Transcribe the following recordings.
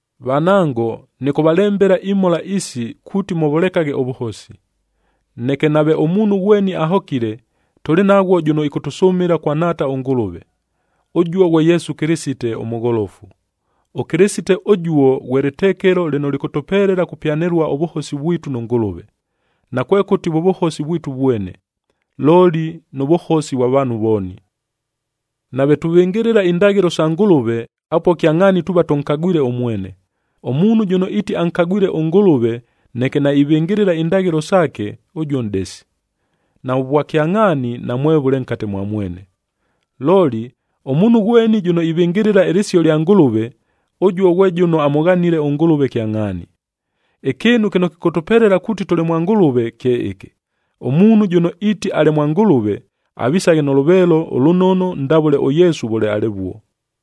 Vanango, nɨkʉvalembela imhola isi, kuuti mʉvʉlekaghe ʉvʉhosi. Neke nave ʉmuunhu ghweni ahokile, tʉlɨ naghwo jʉno ɨkʉtʉsʉmɨla kwa Nhaata ʉNgʉlʉve. Ʉjuo ghwe Yesu Kɨlɨsite, ʉMʉgholofu. ɄKɨlɨsite ʉjuo, ghwe lɨtekelo lɨno lɨkʉtʉpelela kupyanɨlua ʉvʉhosi vwitu nʉ Ngʉlʉve. Nakwekʉti vʉ vʉhosi vwitu vwene, looli nʉ vʉhosi vwa vaanhu vooni. Nave tuvɨngɨlɨla indaghɨlo sa Ngʉlʉve, apuo kyangʼhaani tuuva tʉnkagwile ʉmwene. Ʉmuunhu jʉno iiti ankagwile ʉNgʉlʉve, neke naivɨngɨlɨla indaghɨlo saake, ʉjuo nʼdesi, navʉ vwakyangʼhaani namwevʉle nkate mwa mwene. Looli, ʉmuunhu ghweni jʉno ivɨngɨlɨla ɨlɨsio lya Ngʉlʉve, ʉjuo ghwe jʉno amʉghanile ʉNgʉlʉve kyangʼhaani. Ɨkɨɨnu kɨno kɨkʉtʉpelela kukagʉla kuuti tʉlɨ mwa Ngʉlʉve kye ɨkɨ: Ʉmuunhu jʉno iiti alɨ mwa Ngʉlʉve, avisaghe nʉ lʉveelo ʉlʉnono ndavʉle ʉYesu vʉle alɨvuo.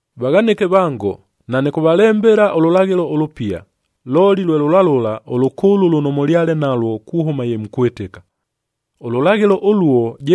Vaghanɨke vango, nanɨkʉvalembela ʉlʉlaghɨlo ʉlʉpia, looli lwe lʉla lʉla, ʉlʉkʉʉlʉ lʉno mʉlyale nalwo kuhʉma ye mukwɨtɨka. Ʉlʉlaghɨlo ʉluo,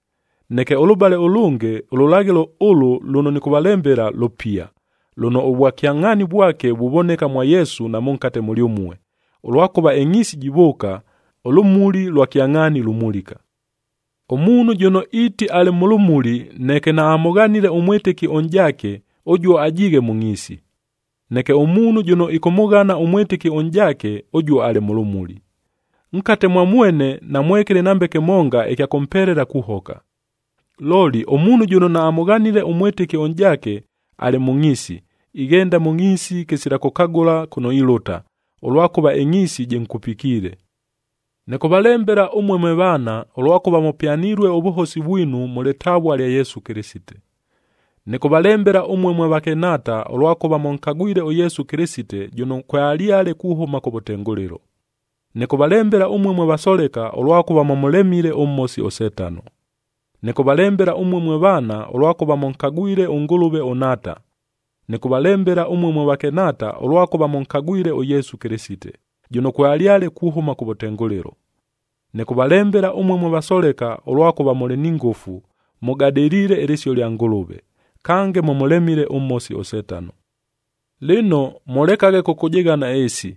Neke ʉlʉbale ʉlʉnge, ʉlʉlaghɨlo ʉlʉ lʉno nɨkʉvalembela lʉpia, lʉno ʉvwakyangʼhaani vwake vuvoneka mwa Yesu na mʉnkate mʉlyʉmue, ʉlwakʉva ɨngʼhiisi jivʉʉka, ʉlʉmuli lwa kyangʼhaani lumulika. Ʉmuunhu jʉno iiti alɨ mʉ lʉmuli, neke naamʉghanile ʉmwɨtɨki ʉnʼjaake, ʉjuo ajiighe mʉ ngʼhiisi. Neke ʉmuunhu jʉno ɨkʉmʉghana ʉmwɨtɨki ʉnʼjaake, ʉjuo alɨ mʉ lʉmuli. Nkate mwa mwene, namwekɨlɨ nambe kɨmonga ɨkya kʉmpelela kuhoka. Looli, ʉmuunhu jʉno naamʉghanile ʉmwɨtɨki ʉnʼjaake, alɨ mʉ ngʼhiisi, ighenda mʉ ngʼhiisi kɨsila kʉkagʉla kʉno ilʉta, ʉlwakʉva ɨngʼhiisi jɨnkupikiile. Nɨkʉvalembela ʉmue mwe vaana, ʉlwakʉva mʉpyanilue ʉvʉhosi vwinu mʉ lɨtavua lya Yesu Kɨlɨsite. Nɨkʉvalembela ʉmue mwe vakɨnhaata, ʉlwakʉva mʉnkagwile ʉYesu Kɨlɨsite, jʉno kwealyale kuhʉma kʉvʉtengʉlɨlo. Nɨkʉvalembela ʉmue mwe vasoleka, ʉlwakʉva mʉmʉlemile ʉMhosi ʉSetano. Nɨkʉvalembela ʉmue mwe vaana, ʉlwakʉva mʉnkagwile ʉNgʉlʉve ʉNhaata. Nɨkʉvalembela ʉmue mwe vakɨnhaata, ʉlwakʉva mʉnkagwile ʉYesu Kɨlɨsite, jʉno kwealyale kuhʉma kʉvʉtengʉlɨlo. Nɨkʉvalembela ʉmue mwe vasoleka, ʉlwakʉva mʉlɨ ni ngʉfu, mʉgadɨliile ɨlɨsio lya Ngʉlʉve, kange mʉmʉlemile ʉMhosi ʉSetano. Lɨno, mʉlekaghe kʉkʉjɨghana ɨɨsi,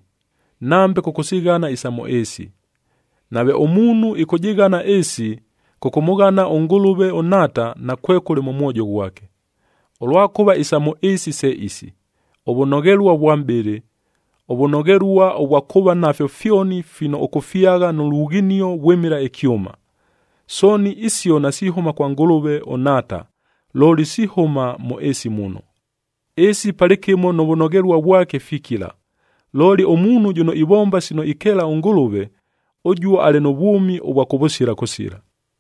nambe kʉkʉsighana isa mʉ ɨɨsi. Nave ʉmuunhu ɨkʉjɨghana ɨɨsi, kʉkʉmʉghana ʉNgʉlʉve ʉNhaata, nakwekʉle mʉ mwojo ghwake. Ʉlwakʉva isa mʉ ɨɨsi se isi: ʉvʉnoghelua vwa mʼbɨlɨ, ʉvʉnoghelua vwa kuuva nafyo fyoni fino ʉkʉfyagha nʉ lughinio vwɨmɨla ɨkyʉma. Sooni isio nasihʉma kwa Ngʉlʉve ʉNhaata, looli sihʉma mʉ ɨɨsi muno. Ɨɨsi palɨkɨmo nʉ vʉnoghelua vwake fikila, looli ʉmuunhu jʉno ivomba sino ikeela ʉNgʉlʉve, ʉjuo alɨ nʉ vwʉmi ʉvwa kʉvʉsila kʉsila.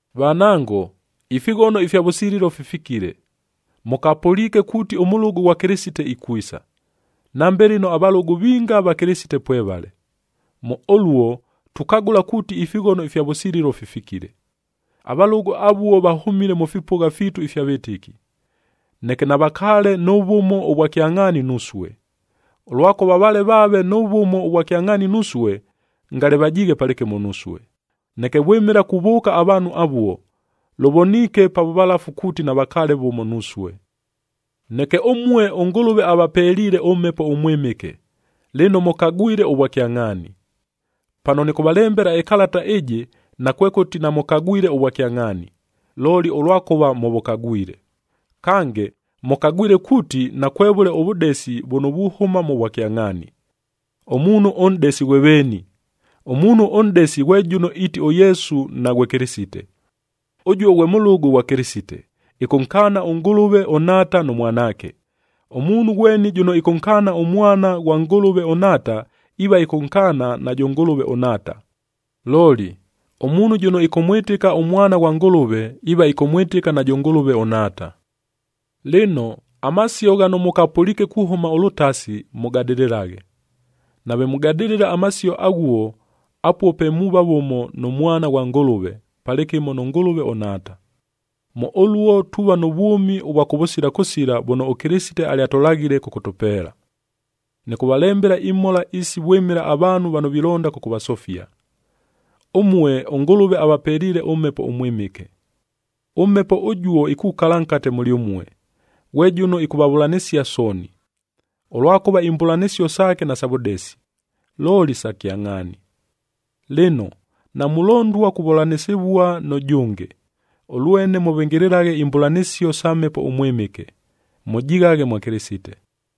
Vanango, ifighono ifya vʉsililo fifikile! Mʉkapʉliike kuuti ʉmʉlʉgʉ ghwa Kɨlɨsiteb ikwisa, nambe lɨno avalʉgʉ vinga va Kɨlɨsite pwevale. Mʉ ʉluo, tukagʉla kuuti ifighono ifya vʉsililo fifikile. Avalʉgʉ avuo vahʉmile mʉ fipʉgha fiitu ifya vɨtɨki, neke navakaale nʉ vʉmo ʉvwa kyangʼhaani nusue. Ʉlwakʉva vale vaave nʉ vʉmo ʉvwa kyangʼhaani nusue, ngale vajiighe palɨkɨmo nusue. Neke vwɨmɨla kuvʉʉka avaanhu avuo, lʉvoniike pa vʉvalafu kuuti navakaale vʉmo nusue. Neke ʉmue ʉNgʉlʉve avapeliile ʉMhepo ʉMwɨmɨke,c lɨno mʉkagwile ʉvwakyangʼhaani. Pano nɨkʉvalembela ɨkalata ɨjɨ, nakwekʉti namʉkagwile ʉvwakyangʼhaani, looli ʉlwakʉva mʉvʉkagwile. Kange, mʉkagwile kuuti nakwevʉle ʉvʉdesi vʉno vuhʉma mʉ vwakyangʼhaani. Ʉmuunhu ʉnʼdesi ghwe veeni? Ʉmuunhu ʉnʼdesi ghwe jʉno iiti ʉYesu naghwe Kɨlɨsite.d Ʉjuo, ghwe mʉlʉgʉ ghwa Kɨlɨsite, ɨkʉnkaana ʉNgʉlʉve ʉNhaata nʉ Mwanaake. Ʉmuunhu ghweni jʉno ɨkʉnkaana ʉMwana ghwa Ngʉlʉve ʉNhaata, iiva ɨkʉnkaana najʉ Ngʉlʉve ʉNhaata. Looli, ʉmuunhu jʉno ɨkʉmwɨtɨka ʉMwana ghwa Ngʉlʉve, iiva ɨkʉmwɨtɨka najʉ Ngʉlʉve ʉNhaata. Lɨno, amasio ghano mʉkapʉliike kuhʉma ʉlʉtasi, mʉgadɨlɨlaghe. Nave mugadɨlɨla amasio aghuo, apuo pe muuva vʉmo nʉ Mwana ghwa Ngʉlʉve, palɨkɨmo nʉ Ngʉlʉve ʉNhaata. Mʉ ʉluo tuuva nʉ vwʉmi ʉvwa kʉvʉsila kʉsila vʉno ʉKɨlɨsite alyatʉlaghile kʉkʉtʉpeela. Nɨkʉvalembela imhola isi vwɨmɨla avaanhu vano vilonda kʉkʉvasofia. Ʉmue, ʉNgʉlʉve avapeliile ʉMhepo ʉMwɨmɨke. ɄMhepo ʉjuo ikukala nkate mʉlyʉmue, ghwe jʉno ɨkʉvavʉlanɨsia sooni, ʉlwakʉva imbʉlanɨsio saake nasa vʉdesi, looli sa kyangʼhaani. Lɨno, namulondua kuvʉlanɨsɨvua nʉ jʉnge.e Ʉlwene, mʉvɨngɨlɨlaghe imbʉlanɨsio sa Mhepo ʉMwɨmɨke, mʉjighaghe mwa Kɨlɨsite.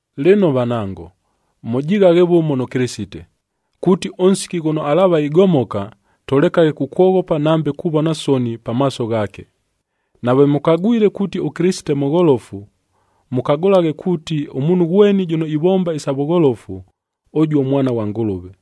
Lɨno vanango, mʉjighaghe vʉmo nʉ Kɨlɨsite, kuuti ʉnsiki ghʉno alaava igomoka, tʉlekaghe kukwoghopa nambe kuvona soni pamaaso ghaake. Nave mʉkagwile kuuti ʉKɨlɨsite mʉgholofu, mʉkagʉlaghe kuuti, ʉmuunhu ghweni jʉno ivomba isa vʉgholofu, ʉjuo mwana ghwa Ngʉlʉve.